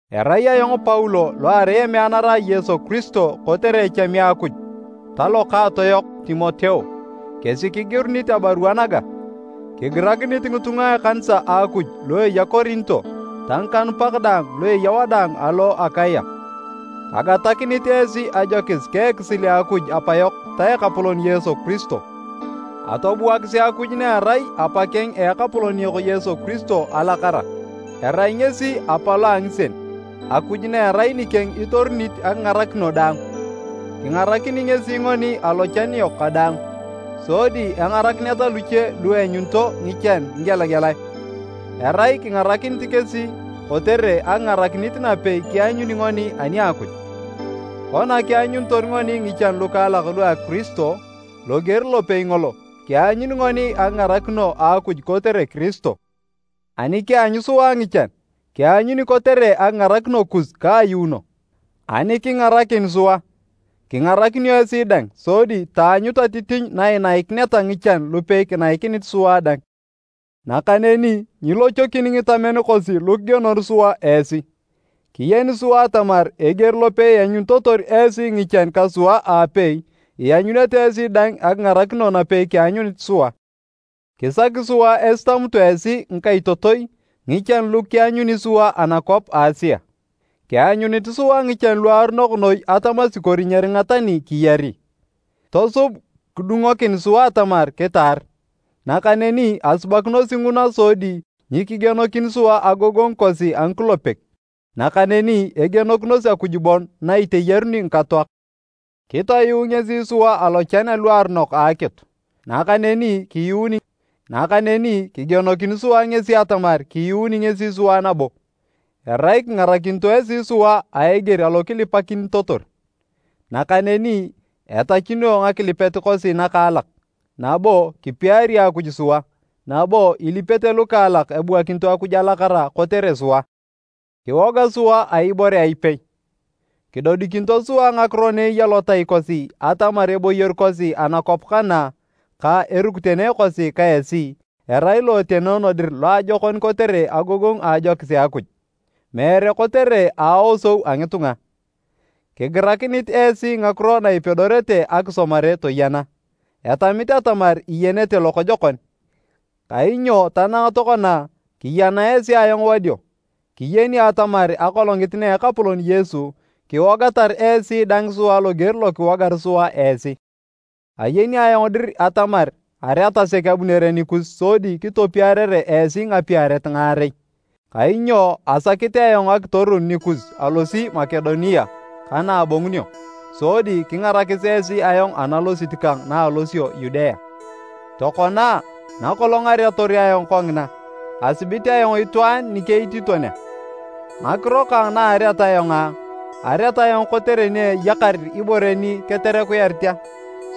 Erai ayong Paulo lo arai emeanara a Yesu Kiristo kotere echami a Akuj, ta Lokaato yok Timoteo, kesi kigirunit abarua naga. Kigirakinit ngitunga a ekanisa a Akuj lu eya Korinto ta ngikanupak daang lu eya wadaang alo Akaya: Kagatakinit esi ajokis ka ekisil a Akuj Apayok ta Ekapolon Yesu Kiristo. Atobuakisi Akuj na erai Apakeng a Ekapolon yok Yesu Kiristo alakara. Erai ngesi Apa lo a ngisien, Akuj na erai nikeng itoronit akingarakino daang! Kingarakini ngesi ngoni alochan yok kadaang, sodi engarakineta luche lu eanyunito ngichan ngigelagelae. Erai kingarakinit kesi kotere akingarakinit napei kianyuni ngoni ani a Akuj. Kona kianyunitor ngoni ngichan lukaalak lua Kiristo, loger lopei ngolo, kianyuni ngoni akingarakino a Akuj kotere Kiristo. Ani kianyu sua ngichan, kianyuni kotere akingarakino kus ka ayuuno. Ani kingarakin sua, kingarakinio esi dang sodi taanyut atitinyu na inaikineta ngichan lupei kinaikinit sua dang. Nakaneni nyilochokin ngitamen kosi lu kigienor sua esi, kiyeni sua atamar eger lopei ianyunitotor esi ngichan ka sua aapei, ianyunete esi dang akingarakino napei kianyunit sua. Kisaki sua esitamutu esi, ngikaitotoi, ngichan lu kianyuni sua anakwap a Asia. Kianyunit sua ngichan luaronok noi atamasi kori nyeringa tani kiyari. Tosub kidungokin sua atamar kitaar. Nakaneni asubakinosi nguna sodi nyikigienokin sua agogongu kosi a ngikulepek, nakaneni egienokinos Akuj bon na iteyaruni ngikatoak. Kitoyuu ngesi sua alochan aluaronok a akitu, nakaneni kiyuuni, nakaneni kigienokin sua ngesi atamar kiyuuni ngesi sua nabo, erai kingarakinito esi sua a eger alo kilipakinitotor. Nakaneni etachunio ngakilipet kosi nakaalak, nabo kipiari Akuj sua, nabo ilipete lukaalak ebuakinito Akuj alakara kotere sua. Kiwoga sua a ibore a ipei. Kidodikinito sua ngakiro na eya lotai kosi atamar eboyor kosi anakwap kana ka erukitene kosi ka esi, arai lo etenoono dir loajokon kotere agogongu a ajokis a Akuj, meere kotere aosou a ngitunga. Kigirikanit esi ngakiro na ipedorete akisomare toyena. Etamit atamar iyenete lokojokon, kainyo tanang tokona, kiyana esi ayong wadio. Kiyeni atamar Akolongit na Ekapolon Yesu, kiwogatar esi dang sua loger lo kiwogar sua esi. Ayeni ayong dir atamar areat sek abunere nikus sodi kitopiarere esi ngapiaret ngaarei. Kainyo asakit ayong akitorun nikus alosi Makedonia ka na abongunio, sodi kingarakis esi ayong analosit kang anaalosio Yudea. Tokona a, nakolong areator ayong kongina, asibit ayong itwaan nikeitiiton a? Ngakiro kang na areat ayong a, areat ayong kotere ni eyakar ibore ni keterekuyarit a?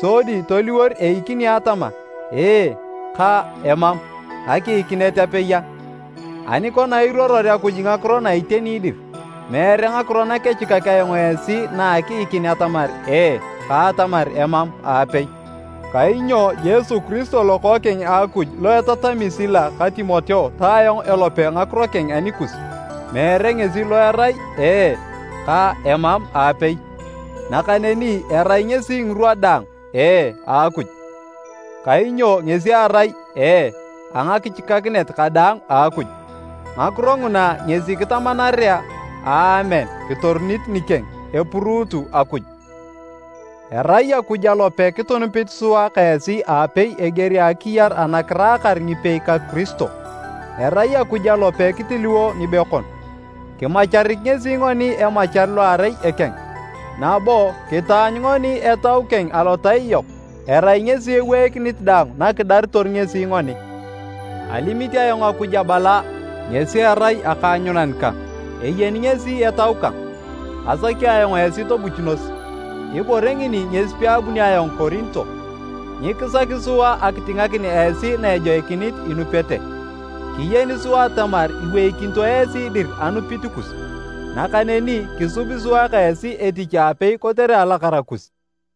Sodi toliwor eikini atama, “Ee” ka “Emam” akiikinet apei a? Ani kona iruoror Akuj ngakiro na iteni dir, meere ngakiro nakechikak ayong esi na akiikin atamar, “Ee” ka atamar “Emam” aapei. Kainyo Yesu Kiristo Lokookeng a Akuj lo etatami Sila ka Timoteo ta ayong elope ngakiro keng anikus, meere ngesi lo erai, “Ee” ka “Emam” aapei. Nakaneni erai ngesi ngirwa daang “Ee” a Akuj. Kainyo ngesi erai “Ee” a ngakichikakinet kadaang a Akuj. Ngakiro nguna ngesi kitamanarea “Aamen” kitorunit nikeng, epuruutu Akuj. Erai Akuj alope kitunup sua ka esi aapei eger a akiyar ana kiraakar ngipei ka Kiristo, erai Akuj alope kitiliwo ngibekon. Kimacharik ngesi ngoni emachar lo erai ekeng, nabo kitaanyu ngoni Etau keng alotai yok erai ngesi eweikinit daang na kidaritor ngesi ngoni. Alimit ayong Akuj abala ngesi erai akaanyunan kang, eyeni ngesi etau kang! Asaki ayong esi tobuchunos, ibore ngini ngesi peabunio ayong Korinto. Nyikisaki sua akitingakin esi na ejoikinit inupete, kiyeni sua atamar iweikinito esi dir anupit kus. Nakaneni, kisubi sua ka esi etich aapei kotere alakara kus.